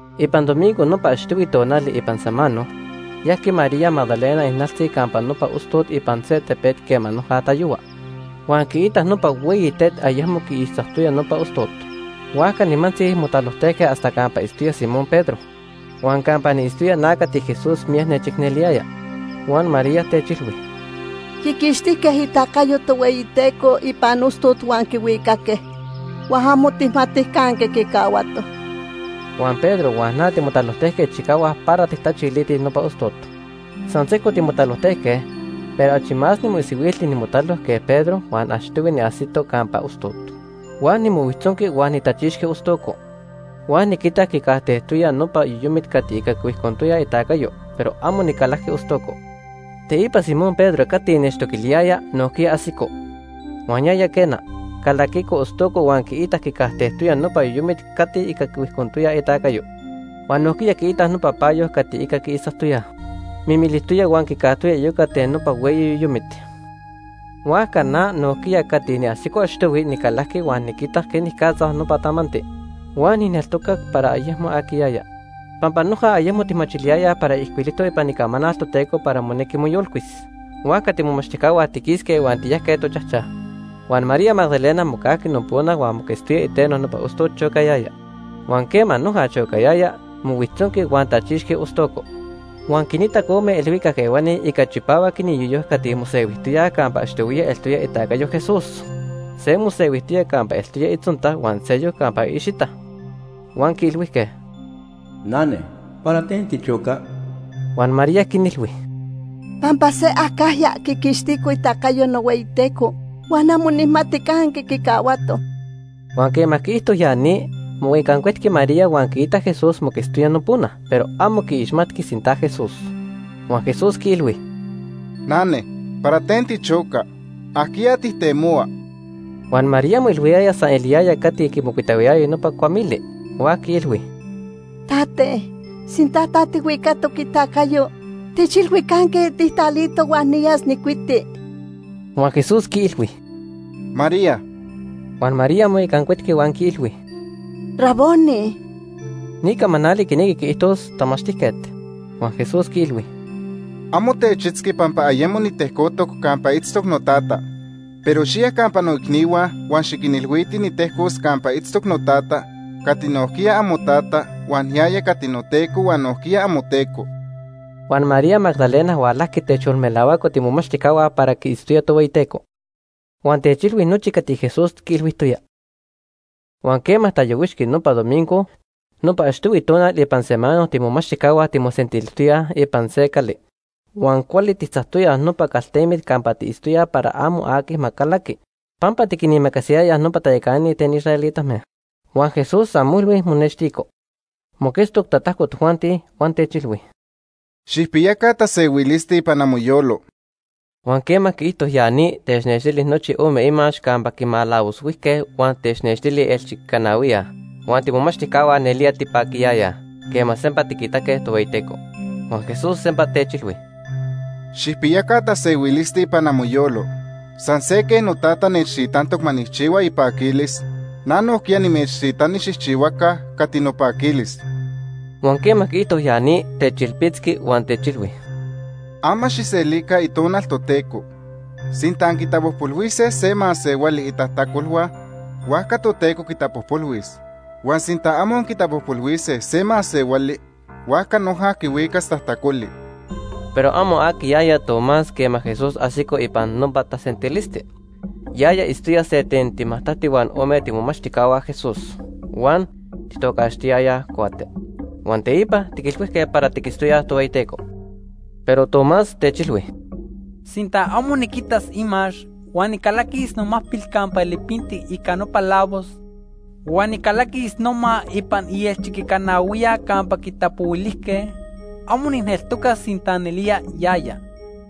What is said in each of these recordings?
Ipan domingo nopa achtohui tonali ipan samano, yajqui María Magdalena ijnaltzi campa nopa ostot ipan se tepet quema noja tatayohua. Huan quiitac nopa hueyi tet ayecmo quiixtzactoya nopa ostot. Huajca nimantzi motalojtejque hasta campa itztoya Simón Pedro huan campa niitztoya na cati Jesús miyac nechicneliyaya. Huan María techilhui: ―Quiquixtijque itacayo Tohueyiteco ipan ostot huan quihuicaque, huan amo tijmatij canque quicahuatoj. Huan Pedro huan na timotalojtejque chicahuac para tijtachilitij nopa ostot. San sejco timotalojque, pero achi más nimoisihuilti nimotalo que Pedro huan achtohui niajsito campa ostot. Huan nimohuijtzonqui huan nitachixqui ostoco, huan niquitac quicajtejtoya nopa yoyomit cati ica quihuijcontoyaj itacayo, pero amo nicalajqui ostoco. Teipa Simón Pedro cati nechtoquiliyaya, nojquiya ajsico. Huan yaya, quena, calaquico ostoco huan quiitac quicajtejtoya nopa yoyomit cati ica quihuijcontoyaj itacayo. Huan nojquiya quiitac nopa payo cati ica quiixtzactoyaj, mimilijtoya huan quicajtoya iyoca ten nopa hueyi yoyomit. Huajca na nojquiya cati niajsico achtohui nicalajqui huan niquitac quenicatza nopa tamanti. Huan nijneltocac para ayecmo aquiyaya. Pampa noja ayemo tijmachiliyayaj para ijcuilijtoc ipan Icamanal Toteco para monejqui moyolcuis. Huajca tiimomachtijcahua tiquisque huan tiyajque tochajchaj. Huan María Magdalena mocajqui nopona huan moquetztoya iteno nopa ostot chocayaya. Huan quema noja chocayaya, mohuijtzonqui huan tachixqui ostoco. Huan quinitac ome ilhuicac ehuani ica chipahuac iniyoyo cati mosehuijtoyaj campa achtohuiya eltoya itacayo Jesús. Se mosehuijtoya campa eltoya itzonta huan seyoc campa iicxita. Huan quiilhuijque: ―Nane, ¿para ten tichoca? Huan María quinilhui: ―Pampa se acajya quiquixtico itacayo nohueyiTeco huan amo nijmati canque quicahuato. Huan quema quiijto ya ni, moicancuetqui María huan quiitac Jesús moquetztoya nopona, pero amo quiixmatqui sinta Jesús. Huan Jesús quiilhui: ―Nane, ¿para ten tichoca? ¿Ajquiya tijtemohua? Huan María moilhuijtoya san eliyaya cati quimocuitahuiyaya nopa cuamili, huajca quiilhui: ―Tate, sinta ta tijhuicatoc itacayo, techilhui canque tijtalito huan niyas nijcuiti. Huan Jesús quiilhui: ―¡María! Huan María moicancuetqui huan quiilhui: ―¡Raboni! (Ni camanali quinequi quiijtos: ‘Tamachtijquet’.) Huan Jesús quiilhui: ―Amo techitzqui pampa ayemo nitejcotoc campa itztoc noTata. Pero xiya campa noicnihua huan xiquinilhuiti nitejcos campa itztoc noTata cati nojquiya amoTata huan yaya cati noTeco huan nojquiya amoTeco. Huan María Magdalena hualajqui techyolmelahuaco tiimomachtijcahua para quiitztoya Tohueyiteco. Huan techilhui nochi cati Jesús quiilhuijtoya. Huan quema tayohuixqui nopa domingo, nopa achtohui tonal ipan samano tiimomachtijcahua timosentilijtoyaj ipan se cali huan cuali tijtzactoyaj nopa caltemit campa tiitztoyaj para amo aqui ma calaqui pampa tiquinimacasiyayaj nopa tayacanani ten israelitame. Huan Jesús san molhui monextico, moquetztoc tatajco tojuanti, huan techilhui: ―Xijpiyaca tasehuilisti ipan amoyolo. Huan quema quiijto ya ni, technextili nochi ome imax campa quimalavoshuijque huan technextili ielchiquicanahuiya. Huan tiimomachtijcahua nelía tipaquiyayaj quema sempa tiquitaque Tohueyiteco. Huan Jesús sempa techilhui: ―Xijpiyaca tasehuilisti ipan amoyolo. San se quej noTata nechtitantoc ma nijchihuas ipaquilis, na nojquiya nimechtitani xijchihuaca cati nopaquilis. Huan quema quiijto ya ni, techilpitzqui huan techilhui: ―Ama xijselica Itonal Toteco. Sinta anquitapojpolhuise se masehuali itajtacolhua, huajca Toteco quitapojpolhuis. Huan sinta amo anquitapojpolhuise se masehuali, huajca noja quihuicas tajtacoli. Pero amo aquiyaya Tomás quema Jesús ajsico ipan nopa tasentilisti. Yaya itztoya se ten timajtacti huan ome tiimomachtijcahua Jesús, huan tijtocaxtiyayaj Cuate. Huan teipa tiquilhuijque para tiquitztoyaj Tohueyiteco. Pero Tomás techilhui: ―Sinta amo niquitas imax, huan nijcalaquis nomacpil campa lipintic ica nopa lavos huan nijcalaquis noma ipan ielchiquicanahuiya campa quitapohuilijque, amo nijneltocas sinta nelía yaya.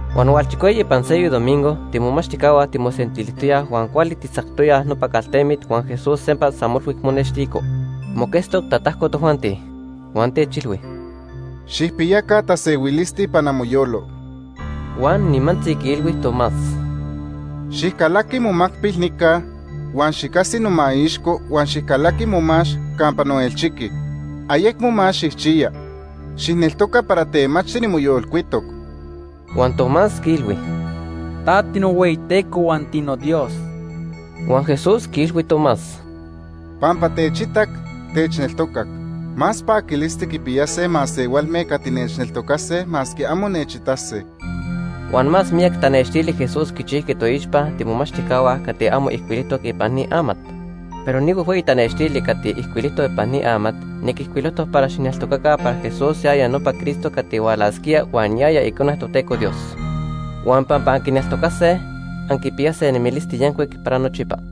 Huan hualchicueyi ipan seyoc domingo tiimomachtijcahua timosentilijtoyaj huan cuali tijtzactoyaj nopa caltemit huan Jesús sempa san molhui monextico, moquetztoc tatajco tojuanti. Huan techilhui: ―Xijpiyaca tasehuilisti ipan amoyolo. Huan nimantzi quiilhui Tomás: ―Xijcalaqui momacpil nica huan xicajsi nomaixco huan xijcalaqui momax campa noelchiqui. Ayecmo más xijchiya. Xijneltoca para temachti nimoyolcuitoc. Huan Tomás quiilhui: ―Ta tinohueyiTeco huan tinoDios. Huan Jesús quiilhui Tomás: ―Pampa techitac, techneltocac. Más paquilisti quipiyase masehualme cati nechneltocase masque amo nechitase. Huan más miyac tanextili Jesús quichijqui toixpa tiimomachtijcahua cati amo ijcuilijtoc ipan ni amat. Pero ni huejhueyi tanextili cati ijcuilijtoc ipan ni amat, niquijcuilojtoc para xijneltocaca para Jesús yaya nopa Cristo cati hualasquía huan yaya Icone Toteco Dios. Huan pampa anquineltocase, anquipiyase nemilisti yancuic para nochipa.